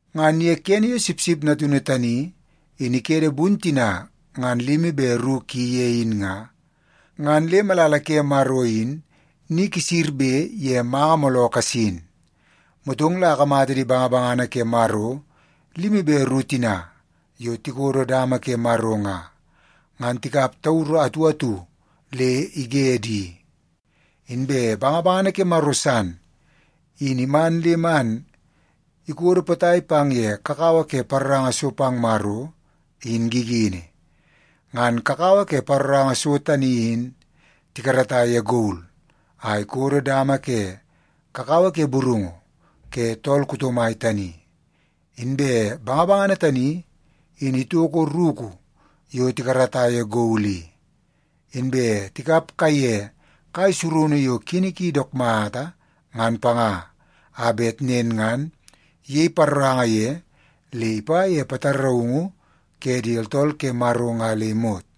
Ngan ye kene yo Sipsip Natunu tani in ikede bun tina ngan limi be ru ki ye in nga, ngan le malala ke Maro in ni kisirbe ye manga mooloo kasin. Motong la akamata di bangabangana ke Maro limi be ru tina yo tikodo dama ke Maro nga, ngan tikap tauru atu atu le ige di. Inbe bangabangana ke Maro san in iman le man ikodo potai pang ye kakawa ke paroranga so pang Maro in gigini. Ngan kakawa ke paroranga so tani in tikarata ye gol a ikodo dama ke kakawa ke burungu ke tool kuto mai tani. Inbe bangabangana tani in itoko ruku yo tikarata ye gol i, inbe tikap kaiye kai surunu yo kini ki dook mata ngan panga, a bet nen ngan iyei paroranga ye le ipa ye pataraungu ke di tooltool ke Maro nga le imot.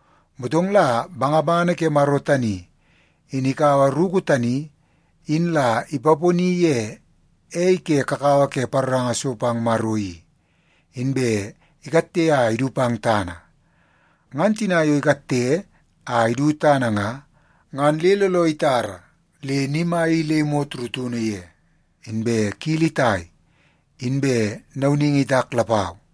Motong la bangabangana ke Maro tani, in ikaua ruku tani in la ipaponi ye ei ke kakawa ke paroranga so pang Maro i, inbe ikatte a idu pang tana. Ngan tina yo ikatte a idu tana nga, ngan le looloo itara le ni mai i le imot rutunu ye, inbe kili itai, inbe nauningi itak lapau.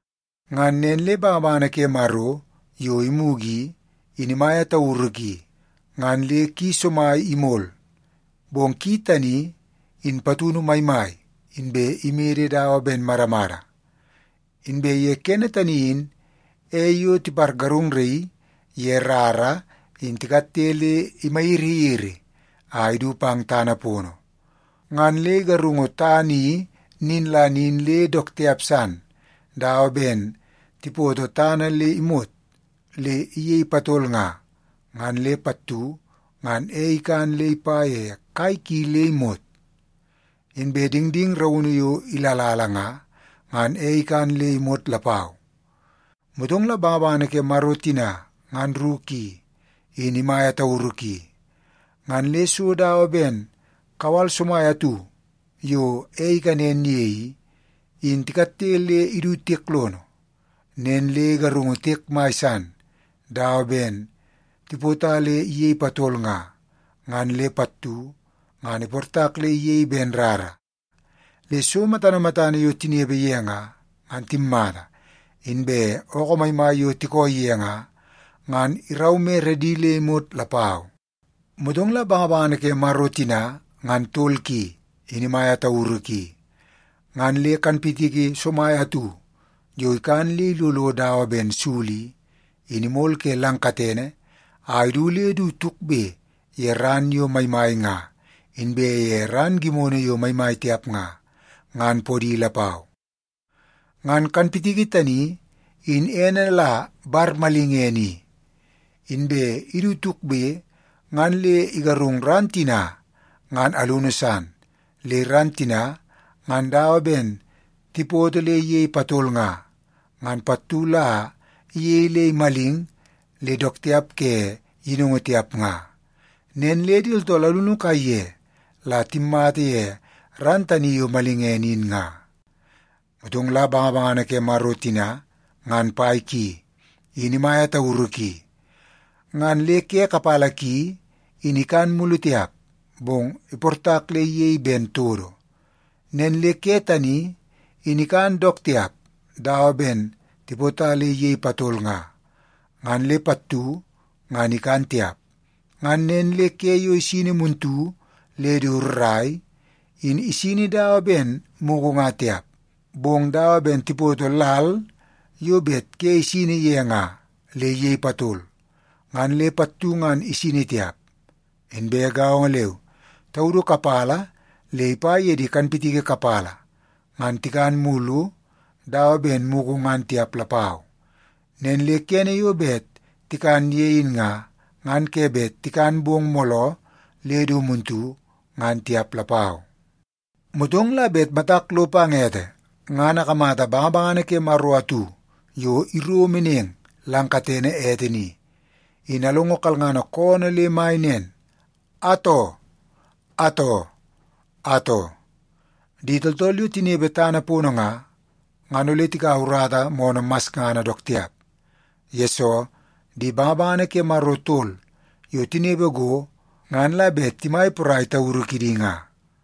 Ngan nen le bangabangana ke Maro yo imugu i, in imaia tauru ki, ngan le ki somai imol, bong ki tani in patunu maimai inbe imede dawa ben madamada. Inbe ye kene tani in ei yo tipargarungnaii ye rara in tikatte le imayiriyiri a idu pang tana pono. Ngan le igarungu tana i nin la nin le dook tiap san dawa ben tipoto tana le imot le iyei patol nga, ngan le pattu ngan ei ikan le ipa ye kai ki le imot. Inbe dingding raunu yo ilala nga, ngan ei ikan le imot lapau. Motong la bangabangana ke Maro tina ngan ru ki, in imaia tauru ki, ngan le so dawa ben kawal somai atu yo ei ikanen ye i, in tikatte le idu tiek lono. Nen le igarungu tiek mai san dawa ben tipota le iyei patol nga, ngan le pattu ngan iportak le iyei ben rara, le so matana matana yo tinepe ye nga, ngan timmata, inbe ookoo maimai yo tikooi ye nga, ngan iraumere di le imot lapau. Motong la bangabangana ke Maro tina ngan tol ki, in imaia tauru ki, ngan le kanpitiki somai atu yo ikan le ilolo dawa ben sul i, in imol ke lang katene a idu le du tukbe ye ran yo maimai nga inbe ye ran gimono yo maimai tiap nga, ngan podi lapau. Ngan kanpitiki tani in ene la Bar Malingene i, inbe idu tukbe ngan le igarung ran tina ngan alunu san. Le ran tina ngan dawa ben tipoto le iyei patol nga, ngan pattu la iyei le imaling le dook ke yinungu tiap nga. Nen le di tooltool alunu kaiye la timmata ye ran tani yo malingene in nga. Motong la bangabangana ke Maro tina ngan pai ki, in imaia tauru ki, ngan le ke kapala ki in ikan mulu tiap, bong iportak le iyei ben todo. Nen le ke tani in ikan dook tiap dawa ben tipota le iyei patol nga, ngan le pattu ngan ikan tiap. Ngan nen le ke yo isini muntu le du rrai, in isini dawa ben mugu nga tiap, bong dawa ben tipoto lal yo bet ke isini ye nga le iyei patol, ngan le pattu ngan isini tiap. Inbe gaongo leu, taudu kapala le ipa ye di kanpitiki kapala ngan tikan mulu dawa ben mugu ngan tiap lapau. Nen le kene yo bet tikan ye in nga, ngan ke bet tikan bong mooloo le du muntu ngan tiap lapau. Motong la bet matak lo pang ete, ngan akamata bangabangana ke Maro atu yo iro meneng lang katene ete ni, in alongo kalngana koonoo le mai nen, “Atoo! Atoo! Atoo, di tooltool yo tinepe tana pono nga, ngan ole tikaua urata moonoo masngana dook tiap, yesoo di bangabangana ke Maro tol yo tinepe go ngan la bet timai porai tauru kidi nga.”